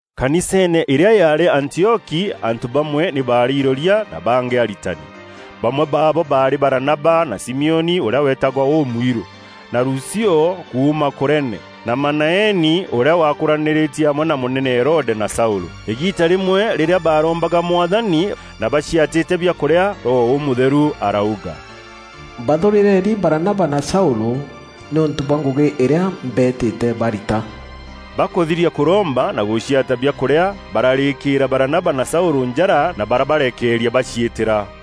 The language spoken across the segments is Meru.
Kaniseene îrîa yaarî Antioki antû bamwe nî baarî iroria na bangî aritani. Bamwe baabo baarî Baranaba na Simioni ûrîa weetagwa Ûmwirû, na Lucio kuuma Kurene na Manaeni ûrîa waakûranîrîtie amwe na mûnene Herode, na Saûlû. Îgiita rîmwe rîrîa baarombaga Mwathani, na baciatîte biakûrîa, Roho Ûmûtheru arauga, “Mbathûrîreni Baranaba na Saûlû nîûntû bwa ngûgî îrîa mbeetîte barita.” Bakûthiria kûromba na gûciata biakûrîa, bararîkîîra Baranaba na Saûlû njara na barabarekeeria baciîtîra.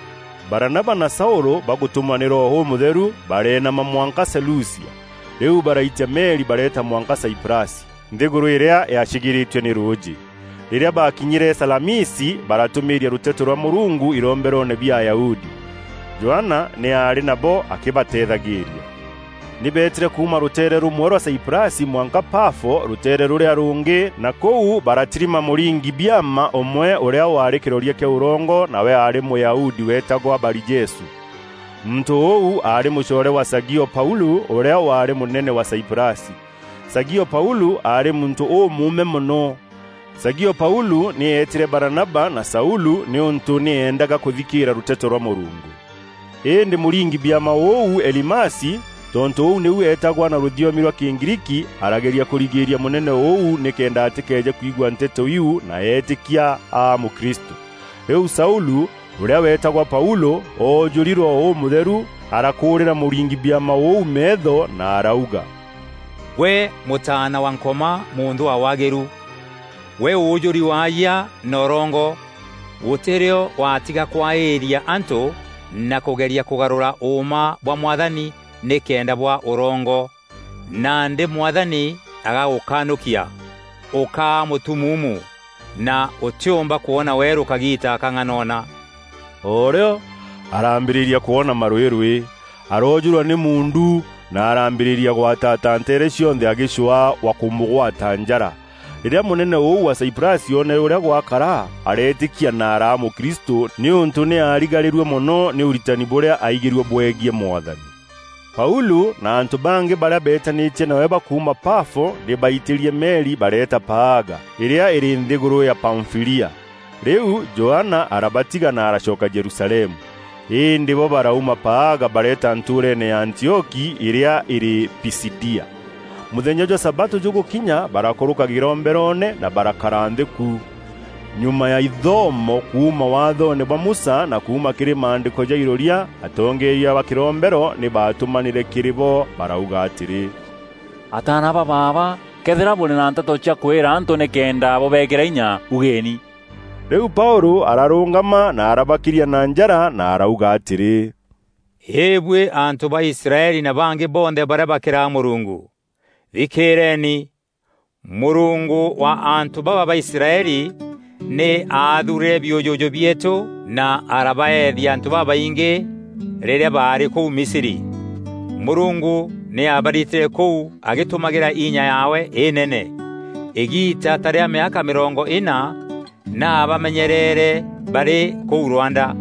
Baranaba na Saûlû bagûtûmwa nî Roho Ûmûtheru, bareenama mwanka Selucia. Rîu baraitia meri bareeta mwanka Saiprasi, nthîgûrû îrîa yaacîgîîrîîtue nî rûûjî. Rîrîa baakinyîre Salamisi baratûmîîria rûteto rwa Mûrungu iromberoone bia Ayahudi. Johana nî aarî nabo akîbateethagîîria. Nî beetîre kuuma rûteere rûmwe rwa Saiprasi mwanka Pafo, rûteere rûrîa rûngî, na kûu baratirima mûringi-biama ûmwe, ûrîa waarî kîroria kîa ûrongo, nawe aarî Mûyahudi weetagwa Barijesû. Muntû ûu aarî mûcoore wa Sagio Paûlû ûrîa waarî mûnene wa Saiprasi. Sagio Paûlû aarî muntû ûmûûme mono. Sagio Paûlû nî eetîre Baranaba na Saûlû nîûntû nî eendaga kûthikîîra rûteto rwa Mûrungu. Îndî mûringi-biama ûu Elimasi (tontû ûu nîu eetagwa na rûthiomi rwa Kîgriiki) arageria kûrigîria mûnene ûu nîkenda atîkeeje kwigua nteto iu na eetîkia aa mûkristû. Rîu Saûlû, ûrîa weetagwa Paûlû, oojûri Roho Ûmûtheru arakûûrîra mûringi biama ûu meetho na arauga, “Gwe mûtaana wa Nkoma, mûnthû wa waagîru. Gwe ûûjûri waayia na ûrongo. Gûtî rîo waatiga kwaîria antû na kûgeria kûgarûra ûûma bwa Mwathani nîkenda bwaa ûrongo. Nandî Mwathani agagûkanûkia; ûkaa mûtumuumu, na ûtîûmba kwona weerû kagiita kang'anona.” O rîo araambîrîria kwona marwîrwî, aroojûrwa nî muundu, na araambîrîria gwataata nteere cionthe agîcwaa wa kûmûgwata njara. Rîrîa mûnene ûu wa Saiprasi oonere ûrîa gwakara, areetîkia na araa mûkristû nîûntû nî aarigarîrue mono nî ûritani bûrîa aigîrue bwegiî Mwathani. Paûlû na antû bangî barîa beetanîtie nawe bakuuma Pafo, nî baitîrie meri bareeta Paaga îrîa îrî nthîgûrû ya Pamfîlia. Rîu Johana arabatiga, na aracoka Jerusalemu. Îndî bo barauma Paaga bareta ntûûreene ya Antioki îrîa îrî Pisidia. Mûthenya jwa sabatû jûgûkinya barakûrûka kîromberoone na barakara nthî ku. Nyuma ya ithomo kuuma Waathoone bwa Musa na kuuma kîrî maandîko ja iroria, atongeeria ba kîrombero nî baatûmanîre kîrî bo barauga atîrî, “Ataana ba baaba këethîra bûrî na nteto cia kwîra antû nîkenda bûbeekîra inya, ugeni.” Rîu Paûlû ararûngama na arabakiria na njara na arauga atîrî, “Îbuî antû ba Israeli na bangî bonthe barîa bakîraga Mûrungu, thikîîreeni! Mûrungu wa antû baba ba Israeli nî aathuurîre biûjûjû bieetû na arabaethia antû babaingî rîrîa baarî kûu Misri. Mûrungu nî aabaritîre kûu agîtumagîra inya yaawe înene. Îgiita ta rîa mîaka mîrongo îna nî aabamenyereere barî kûu rwanda.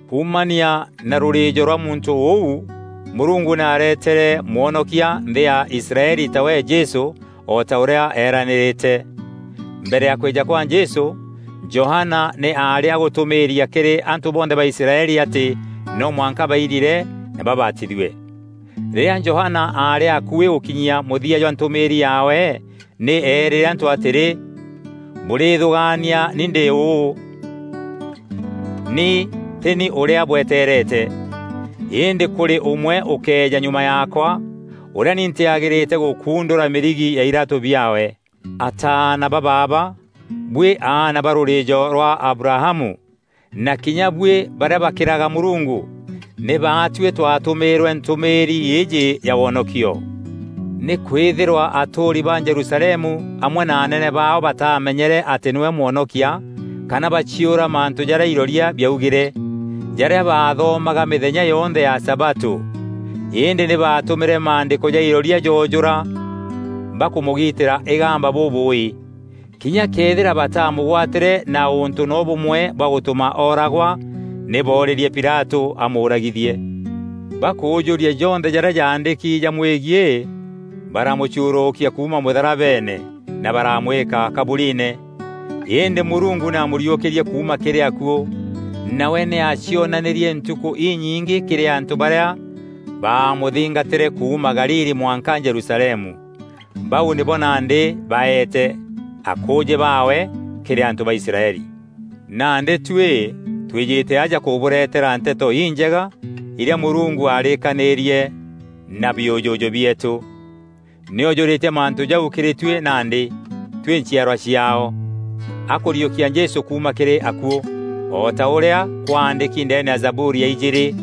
Kuumania na rûrîîjo rwa muntû ûu, Mûrungu nî aretete Mwonokia nthî ya Israeli, tawe Jesû, o ta ûrîa eeranîrîte. Mbere ya kwîja kwa Jesû, Johana nî aarî agûtûmîîria kîrî antû bonthe ba Israeli atî no mwanka bairire na babatithue. Rîrîa Johana aarî akuî gûkinyia mûthia jwa ntûmîîri yaawe nî eerîre antû atîrî, ‘Bûrîthûgaania ni ndî ûu? Ni tî ni ûrîa bweteerete. Îndî kûrî ûmwe ûkeeja nyuma yaakwa, ûrîa ni ntîagîrîte gûkundûra mîrigi ya iraatû biaawe.’ “Ataana ba baaba, buî aana ba rûrîîjo rwa Abrahamu, na kinya buî barîa bakîraga Mûrungu, nî baatuî twatûmîîrwe ntûmîîri îîjî ya wonokio. Nîkwîthîrwa atûûri ba Jerusalemu amwe na anene baao bataamenyere atî nîwe Mwonokia, kana baciûra mantû jarîa iroria biaugîre, jarîa baathomaga mîthenya yonthe ya sabatû. Îndî nî baatûmîre maandîko ja iroria joojûra bakûmûgitîra îgamba bûbûûî. Kinya këethîra bataamûgwatîre na ûntû noo bûmwe bwa gûtûma ooragwa, nî boorîrie Pilatû amûûragithie. Bakûûjûria jonthe jarîa jaandîki jamwegiî, baramûcuurûkia kuuma mûtharabeene, na baramwîka kaburiine. Îndî Mûrungu nî aamûriûkîrie kuuma kîrî akuû. Nawe nî aacionanîrie ntukû inyingî kîrî antû barîa baamûthingatîre kuuma Galili mwanka Jerusalemu. Bau nîbo nandî baeete akûûjî baawe kîrî antû ba Israeli. Nandî tuî twîjîte aja kûbûreetera Nteto Injega îrîa Mûrungu aarîîkanîrie na biûjûjû bieetû, nî oojûrîtie mantû jau kîrî tuî nandî, tuî nchiarwa ciaao, akûriûkia Jesû kuuma kîrî akuû. O ta ûrîa kwaandîki ndeene ya Zaburi ya ijîîrî: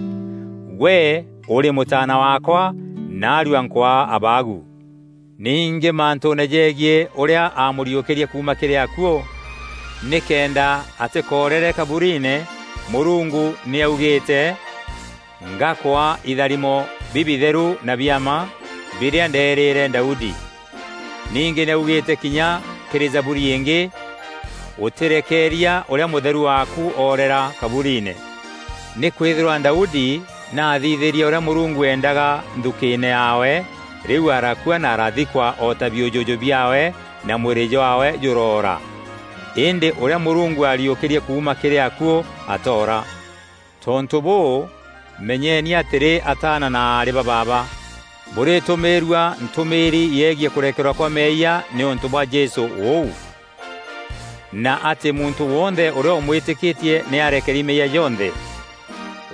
‘Gwe ûrî Mûtaana waakwa, naarua nkwaa abaagu.’ “Ningî mantûûne jegiî ûrîa aamûriûkîrie kuuma kîrî akuû, nîkenda atîkoorere kaburiine, Mûrungu nî aaugîîte, ‘Ngakwaa itharimo bibitheru na bia mma, birîa ndeerîîre Daudi.’ “Ningî nî augîîte kinya kîrî Zaburi ingî, ‘Ûtîrekeeria Ûrîa Mûtheru waaku, oorera kaburiine.’ “Nîkwîthîrwa Daudi nî aathithîrie ûrîa Mûrungu eendaga nthukîîne yaawe, rîu arakua na arathikwa o ta biûjûjû biaawe na mwîrî jwaawe jûroora. Îndî ûrîa Mûrungu aariûkîrie kuuma kîrî akuû atoora. Tontû bûû, menyeni atîrî ataana na aarî ba baaba, bûrîtûmîîrua ntûmîîri yegiî kûrekerwa kwa meeyia nîûntû bwa Jesû ûu, na atî muntû wonthe ûrîa ûmwîtîkîtie nî arekeeri meeyia jonthe.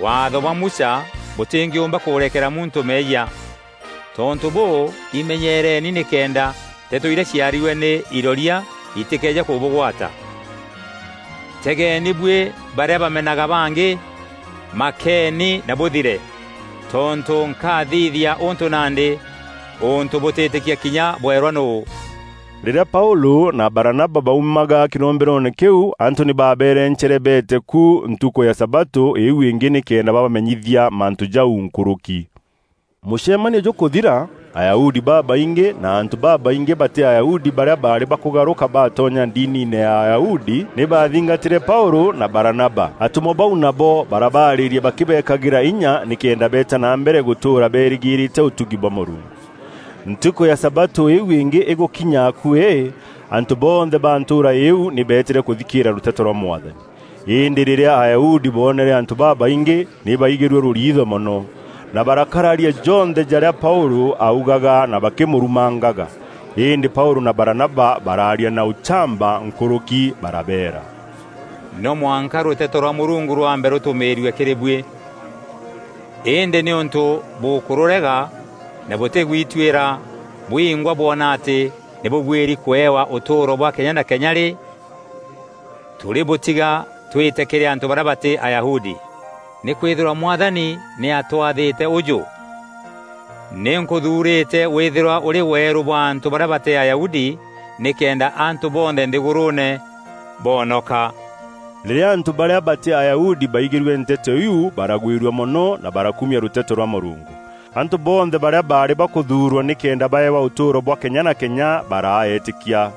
Waatho bwa Musa bûtîngîûmba kûrekera muntû meeyia. Tontû bûû, imenyeereni nîkenda nteto irîa ciaarîrue nî iroria itîkeeje kûbûgwata: ‘Tegeeni buî barîa bamenaga bangî, makeeni na bûthire! Tontû nkathithia ûntû nandî, ûntû bûtîîtîkia kinya bwerwa nûû.’” Rîrîa Paûlû na Baranaba baumaga kîromberoone kîu, antû nî baabeerencere beete ku ntukû ya sabatû îîu îngî nîkenda babamenyithia mantû jau nkûrûki. Mûcemanio jûkûthira, Ayahudi babaingî na antû babaingî batî Ayahudi barîa baarî bakûgarûka baatonya ndiniine ya Ayahudi nî baathingatîre Paûlû na Baranaba. Atûmwa bau nabo barabaarîria bakîbekagîra inya nîkenda beeta na mbere gûtûûra beerîgîîrîte ûtugi bwa Mûrungu. Ntukû ya sabatû îîu îngî îgûkinya akuî, antû bonthe ba ntûûra îîu nî beetîre kûthikîîra rûteto rwa Mwathani. Îndî rîrîa Ayahudi boonere antû babaingî, nî baigîrue rûriitho mono, na barakararia jonthe jarîa Paûlû augaga na bakîmûrumangaga. Îndî Paûlû na Baranaba baraaria na ûchamba nkûrûki barabeera, “No mwanka rûteto rwa Mûrungu rwambe rûtûmîîrue kîrî buî. Îndî nîûntû bûkûrûrega na bûtîgwituîra bwingwa bwona atî nî bûbuîri kûewa ûtûûro bwa kenya na kenya rî, tûrîbûtiga twîte kîrî antû barîa batî Ayahudi. Nîkwîthîrwa Mwathani nî atwathîte ûjû: ‘Nî nkûthuurîte wîthîrwa ûrî weerû bwa antû barîa batî Ayahudi, nîkenda antû bonthe nthîgûrûûne boonoka.’” Rîrîa antû barîa batî Ayahudi baigîrue nteto iu baragwîrua mono na barakumia rûteto rwa Mûrungu. Antû bonthe barîa baarî bakûthuurwa nîkenda baeewa ûtûûro bwa kenya na kenya baraa eetîkia.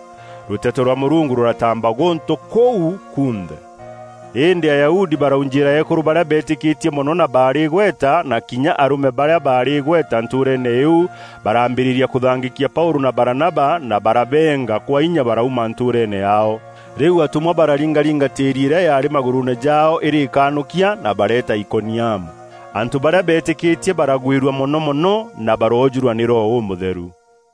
Rûteto rwa Mûrungu rûrataamba gûntû kûu kunthe. Îndî Ayahudi baraujîîra eekûrû barîa beetîkîtie mono na baarî îgweta, na kinya arûme barîa baarî îgweta ntûûreene îîu barambîrîria kûthangîkia Paûlû na Baranaba, na barabeenga kwa inya barauma ntûûreene yaao. Rîu atûmwa bararingaringa tîîri îrîa yaarî magûrûûne jaao îrî îkanûkia, na bareeta Ikoniamu. Antû barîa beetîkîtie baragwîrua mono mono na baroojûrwa nî Roho Ûmûtheru.